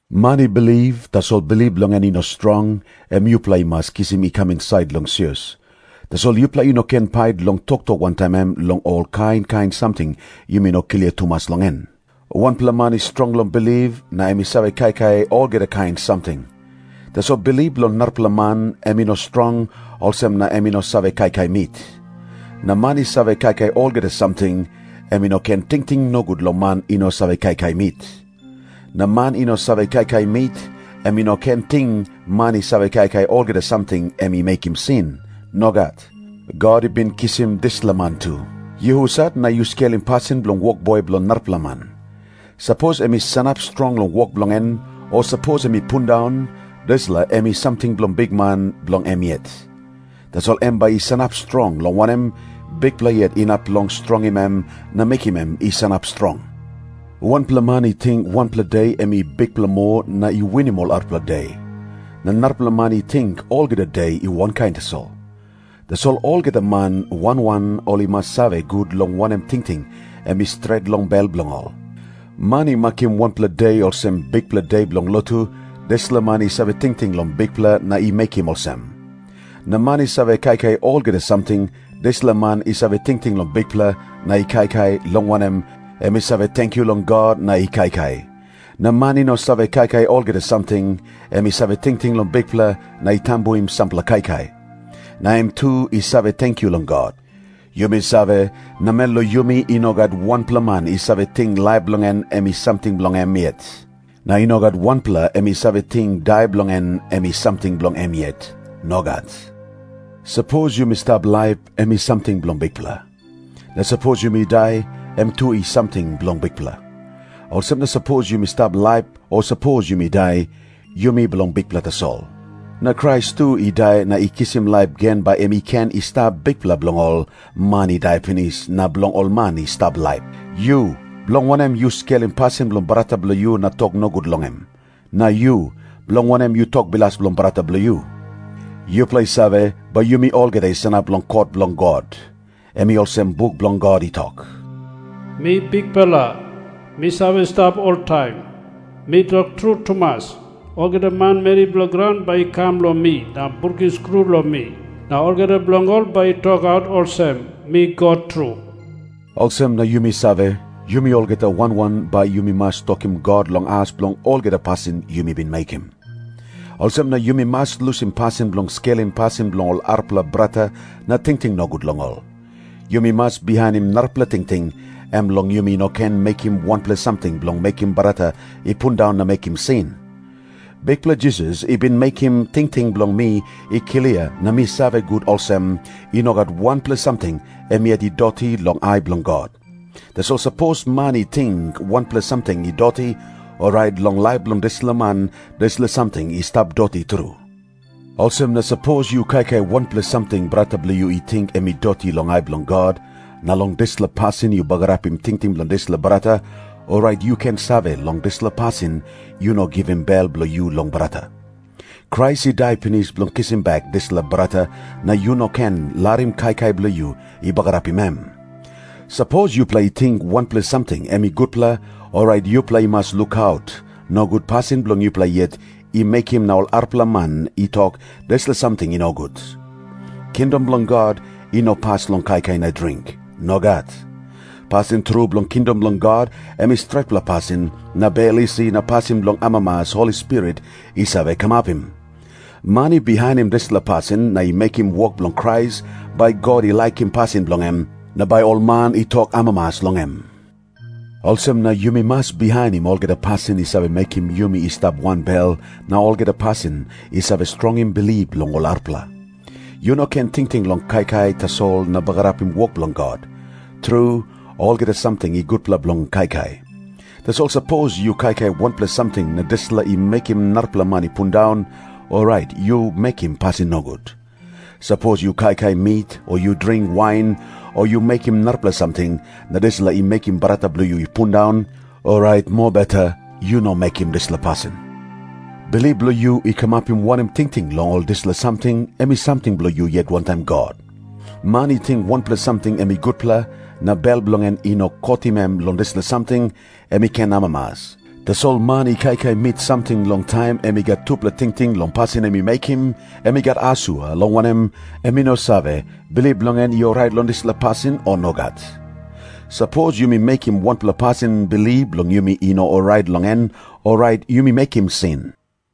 Man i bilip, tasol bilip bilong en i no strong, em yupela i mas kisim i kam insait long sios. Tasol yupela i no ken pait long toktok wantaim em long ol kain kain samting yumi no klia tumas long en. Wanpela man i strong long bilip, na em i save kaikai olgeta kain samting. Tasol bilip bilong narapela man em i no strong, olsem na em i no save kaikai mit. Na man i save kaikai olgeta samting, em i no ken tingting nogut long man i no save kaikai mit. Na man i no save kaikai mit, em i no ken ting man i save kaikai olgeta samting em i mekim sin. Nogat. God i bin kisim dispela man tu. Yu husat na yu skelim pasin bilong wokboi bilong narapela man? Sapos em i sanap strong long wok bilong en, o sapos em i pundaun, dispela em i samting bilong Bikman bilong em yet. Tasol em bai i sanap strong, long wanem, Bikpela yet inap long strongim em na mekim em i sanap strong. Wanpela man i ting wanpela de em i bikpela moa na i winim ol arapela de. Na narapela man i ting olgeta de i wankain tasol. Tasol olgeta man wan wan ol i mas save gut long wanem tingting em i stret long bel bilong ol. Man i makim wanpela de olsem bikpela de bilong lotu, dispela man i save tingting long Bikpela na i mekim olsem. Na man i save kaikai olgeta samting, dispela man i save tingting long Bikpela na i kaikai, long wanem, em i save tenkyu long God na i kaikai. Na man i no save kaikai olgeta samting, em i save tingting long Bikpela na i tambuim sampela kaikai. Na em tu i save tenkyu long God. Yumi save, namel long yumi i no gat wanpela man i save ting laip bilong en em i samting bilong em yet. Na i no gat wanpela em i save ting dai bilong en em i samting bilong em yet. Nogat. Sapos yumi stap laip, em i samting bilong Bikpela. Na sapos yumi dai, em tu i samting bilong Bikpela. Olsem na sapos yumi stap laip, o sapos yumi dai, yumi bilong Bikpela tasol. Na Krais tu i dai na i kisim laip gen bai em i ken i stap Bikpela bilong ol man i dai pinis na bilong ol man i stap laip. Yu, bilong wanem yu skelim pasin bilong brata bilong yu na tok nogut long em? Na yu, bilong wanem yu tok bilas long brata bilong yu? Yupela i save, bai yumi olgeta i sanap long kot bilong God. Em i olsem buk bilong God i tok, “Mi Bikpela, mi save stap oltaim, mi tok tru tumas, olgeta manmeri bilong graun bai i kam long mi na brukim skru long mi. Na olgeta bilong ol bai i tokaut olsem, mi God tru.” Olsem na yumi save, yumi olgeta wan wan bai yumi mas tokim God long as bilong olgeta pasin yumi bin mekim. Olsem na yumi mas lusim pasin bilong skelim pasin bilong ol arapela brata na tingting nogut long ol. Yumi mas bihainim narapela tingting, em long yumi no ken mekim wanpela samting bilong mekim brata i pundaun na mekim sin. Bikpela Jisas i bin mekim tingting bilong mi i klia, na mi save gut olsem, i no gat wanpela samting em yet i doti long ai bilong God. Tasol sapos man i ting wanpela samting i doti, orait long laip bilong dispela man dispela samting i stap doti tru. Olsem na sapos yu kaikai wanpela samting brata bilong yu i ting em i doti long ai bilong God, na long dispela pasin yu bagarapim tingting bilong dispela brata, orait yu ken save, long dispela pasin yu no givim bel bilong yu long brata. Krais i dai pinis bilong kisim bek dispela brata, na yu no ken larim kaikai bilong yu i bagarapim em. Sapos yupela i ting wanpela samting em i gutpela, orait yupela i mas lukaut, nogut pasin bilong yupela yet i mekim na ol arapela man i tok dispela samting i nogut. Kingdom bilong God i no pas long kaikai na dring. Nogat. Pasin tru bilong kingdom bilong God em i stretpela pasin na bel isi na pasin bilong amamas Holi Spirit i save kamapim. Man i bihainim dispela pasin na i mekim wok bilong Krais, bai God i laikim pasin bilong em, na bai ol man i tok amamas long em. Olsem na yumi mas bihainim olgeta pasin i save mekim yumi i stap wanbel, na olgeta pasin i save strongim bilip bilong ol arapela. Yu no ken tingting long kaikai tasol na bagarapim wok bilong God. Tru, olgeta samting i gutpela bilong kaikai. Tasol sapos yu kaikai wanpela samting na dispela i mekim narapela man i pundaun, orait yu mekim pasin nogut. Sapos yu kaikai mit o yu dring wain o yu mekim narapela samting, na dispela i mekim brata bilong yu i pundaun, orait mobeta yu no mekim dispela pasin. Bilip bilong yu i kamapim wanem tingting long ol dispela samting, em i samting bilong yu yet wantaim God. Man i ting wanpela samting em i gutpela, na bel bilong en i no kotim em long dispela samting, em i ken amamas. Tasol man i kaikai mit samting long taim em i gat tupela tingting long pasin em i mekim, em i gat asua, long wanem, em i no save, bilip bilong en i orait long dispela pasin, o nogat. Sapos yumi mekim wanpela pasin bilip bilong yumi i no orait long en, orait yumi mekim sin.